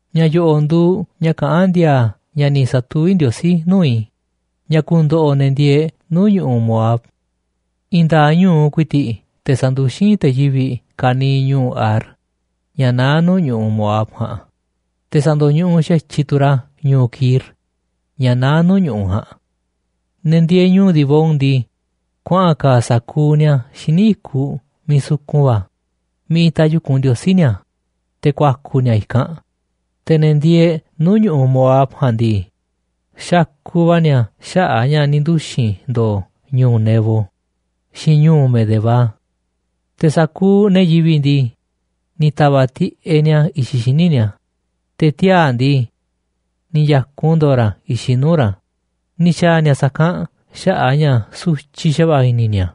Ña̱ yo̱ꞌo̱ꞌ nduuꞌ ña̱ kaꞌán ndi̱a̱a̱ ña̱ ni̱ sa̱tuví Ndiosí nuu̱ꞌ i̱ ña̱ ku̱ndo̱ꞌo̱ ne̱ ndieeꞌ nuu̱ꞌ ñu̱ꞌuꞌ Moab. I̱i̱n nda̱a̱ꞌ ñu̱u ku̱i̱ti̱ꞌ te̱ sa̱nduxín te̱ yivi̱ꞌ ka̱niiꞌ ñu̱u̱ Ar, ña̱ naá nuu̱ꞌ ñu̱ꞌuꞌ Moab ja̱a̱nꞌ, te̱ sa̱ndo̱ñuꞌuꞌ xa̱tyiꞌ tu̱ ra̱ ñu̱u̱ Kir, ña̱ naá tu̱ nuu̱ꞌ ñu̱ꞌuꞌ ja̱a̱nꞌ. Ne̱ ndieeꞌ ñu̱u̱ Dibón ndii, kuaꞌa̱n ka̱a̱ sa̱kuuꞌ ni̱a̱ xíniꞌ i̱kuꞌ miiꞌ sukun va̱ miiꞌ itaꞌ yu̱kunꞌ ndiosí ni̱a̱, te̱ ku̱a̱ku̱ ni̱a̱ i̱kanꞌ. Te̱ ne̱ ndieeꞌ nuu̱ꞌ ñu̱ꞌuꞌ Moab ja̱a̱nꞌ ndii, xakuꞌ va̱ ni̱a̱ xaꞌa̱ꞌ ña̱ ni̱ nduxi̱n ndo̱o̱ ñu̱u̱ Nebo xiinꞌ ñu̱u̱ Medeba. Te̱ sa̱kuuꞌ ne̱ yivi̱ꞌ ndii, ni̱ ta̱va̱ꞌ tiꞌeꞌ ni̱a̱ i̱xiꞌ xíniꞌ ni̱a̱, te̱ tiaa̱ ndii, ni̱ ya̱kun ndo̱o̱ ra̱ i̱xiꞌ nuu̱ꞌ ra̱, ni̱ xa̱a̱ ni̱a̱ sa̱kanꞌ xaꞌa̱ꞌ ña̱ sutyiꞌ xa̱va̱ꞌa̱ i̱ni̱ ni̱a̱.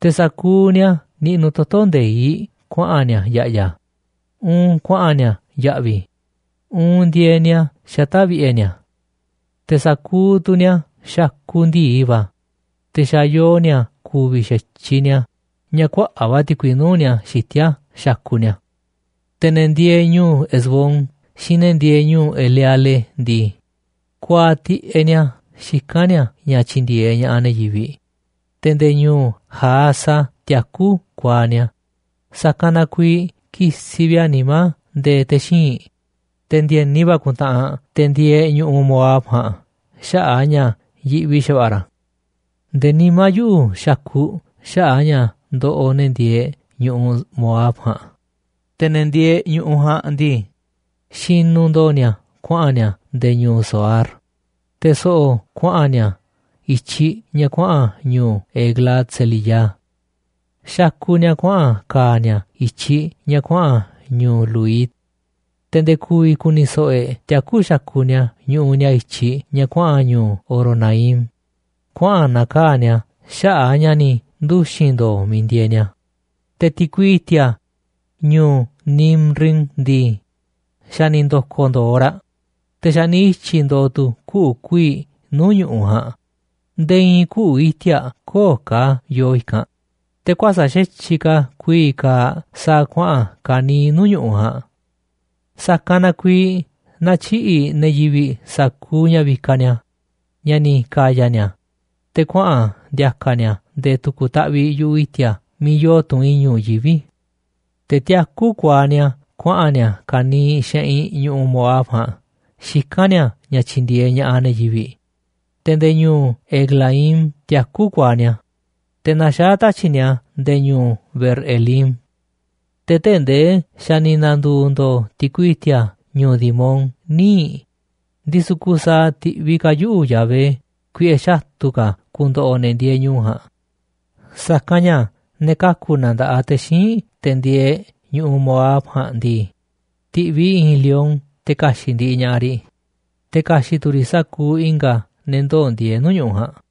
Te̱ sa̱kuuꞌ ni̱a̱ niꞌnuꞌ toto̱ nde̱iꞌ kuaꞌa̱n ni̱a̱ ya̱ꞌya̱, uun kuaꞌa̱n ni̱a̱ ya̱ꞌvi̱, uun ndieeꞌ ni̱a̱ xata̱ꞌ vi̱ꞌe̱ ni̱a̱. Te̱ sa̱kuuꞌ tu̱ ni̱a̱ xakuꞌ ndi̱i va̱, te̱ xa̱ yoo ni̱a̱ ku̱vi̱ xa̱tyiꞌ ni̱a̱ ña̱ kuaꞌa̱ꞌ va̱ ti̱kui nuu̱ꞌ ni̱a̱ xitíá xakuꞌ ni̱a̱. Te̱ ne̱ ndieeꞌ ñu̱u̱ Hesbón xiinꞌ ne̱ ndieeꞌ ñu̱u̱ Eleale ndii, kuaaꞌ tiꞌeꞌ ni̱a̱ xikán ni̱a̱ ña̱ tyi̱ndi̱e̱eꞌ ña̱ꞌaꞌ ne̱ yivi̱ꞌ, te̱ nde̱e̱ ñu̱u̱ Jahaza tiakú kuaaꞌ ni̱a̱, sa̱kanꞌ na kuiiꞌ kisiꞌ vi̱ꞌ a̱ nimá nde̱e̱ te̱ xíinꞌ, te̱ ndi̱e̱ni va̱ ku̱ntaꞌanꞌ te̱ ndieeꞌ ñu̱ꞌuꞌ Moab ja̱a̱nꞌ xaꞌa̱ꞌ a̱ ña̱ yiꞌvi xa̱va̱ꞌa̱ ra̱. Nde̱e̱ nimá yuꞌu̱ xakuꞌ xaꞌa̱ꞌ ña̱ ndoꞌoꞌ ne̱ ndieeꞌ ñu̱ꞌuꞌ Moab ja̱a̱nꞌ, te̱ ne̱ ndieeꞌ ñu̱ꞌuꞌ ja̱a̱nꞌ ndii, xinuꞌ ndo̱o̱ ni̱a̱ kuaꞌa̱n ni̱a̱ nde̱e̱ ñu̱u̱ Zoar, te̱ so̱ꞌo̱ kuaꞌa̱n ni̱a̱ i̱tyiꞌ ña̱ kuaꞌa̱n ñu̱u̱ Eglat-selisiyá. Xakuꞌ ni̱a̱ kuaꞌa̱n ka̱a̱ ni̱a̱ i̱tyiꞌ ña̱ kuaꞌa̱n ñu̱u̱ Luhit. Te̱ nde̱e̱ ku̱vi̱ ku̱ni̱ so̱ꞌo̱ e̱ꞌ tiakú xakuꞌ ni̱a̱ ñuꞌuꞌ ni̱a̱ i̱tyiꞌ ña̱ kuaꞌa̱n ñu̱u̱ Horonaim, kuaꞌa̱n na̱kaa̱ꞌ ni̱a̱ xaꞌa̱ꞌ a̱ ña̱ ni̱ nduxi̱n ndo̱o̱ miiꞌ ndieeꞌ ni̱a̱. Te̱ ti̱kui i̱ti̱a̱ ñu̱u̱ Nimrim ndii, xa̱ ni̱ ndo̱ko̱ ndo̱o̱ raꞌ, te̱ xa̱ ni̱ ityi̱ ndo̱o̱ tu̱ kuꞌu̱ kuiiꞌ nuu̱ꞌ ñu̱ꞌuꞌ ja̱a̱nꞌ, nde̱e̱ i̱i̱n kuꞌu̱ iti̱a̱ꞌ köo̱ꞌ ka̱ yoo i̱kanꞌ, te̱ kuäsa̱ꞌ xa̱tyiꞌ ka̱ kuii̱ꞌ kaaꞌ sa̱a̱ kuaꞌa̱n ka̱niiꞌ nuu̱ꞌ ñu̱ꞌuꞌ ja̱a̱nꞌ. Sa̱kanꞌ na kuiiꞌ natyiꞌi̱ꞌ ne̱ yivi̱ꞌ sa̱kuuꞌ ña̱ vikaꞌ ni̱a̱ ña̱ ni̱ ka̱ya̱ ni̱a̱, te̱ kuaꞌa̱n ndi̱a̱ka̱ ni̱a̱ nde̱e̱ tu̱ku̱ taꞌviꞌ yu̱ꞌuꞌ i̱ti̱a̱ miiꞌ yoo tunꞌ i̱ñu̱ꞌ yivi̱ꞌ. Te̱ tiakú kuaaꞌ ni̱a̱ kuaꞌa̱n ni̱a̱ ka̱niiꞌ xeꞌinꞌ ñu̱ꞌuꞌ Moab ja̱a̱nꞌ xikán ni̱a̱ ña̱ tyi̱ndi̱e̱eꞌ ña̱ꞌaꞌ ne̱ yivi̱ꞌ, te̱ nde̱e̱ ñu̱u̱ Eglaim tiakú kuaaꞌ ni̱a̱, te̱ naxaá tatyi̱ꞌ ni̱a̱ nde̱e̱ ñu̱u̱ Beer-elim. Te̱ tee̱ꞌ ndee xa̱ ni̱ na̱ndu̱u̱ ndo̱o̱ ti̱kui i̱ti̱a̱ ñu̱u̱ Dimón níiꞌ, ndisu̱ kusaaꞌ ti̱ꞌviꞌ ka̱ yuꞌu̱ Yahvé kuiꞌe̱ xatu̱ ka̱ ku̱ndo̱ꞌo̱ ne̱ ndieeꞌ ñu̱u̱ ja̱a̱nꞌ, sa̱kanꞌ ña̱ ne̱ kaku̱ na nda̱ꞌaꞌ te̱ xíinꞌ te̱ ndieeꞌ ñu̱ꞌuꞌ Moab ja̱a̱nꞌ ndii, ti̱ꞌviꞌ i̱ i̱i̱n lion te̱ ka̱xi̱ꞌ ndiꞌiꞌ ña̱ꞌaꞌ riꞌ, te̱ ka̱xi̱ꞌ tu̱ riꞌ sa̱kuuꞌ i̱nga̱ ne̱ ndoo̱ ndieeꞌ nuu̱ꞌ ñu̱ꞌuꞌ ja̱a̱nꞌ.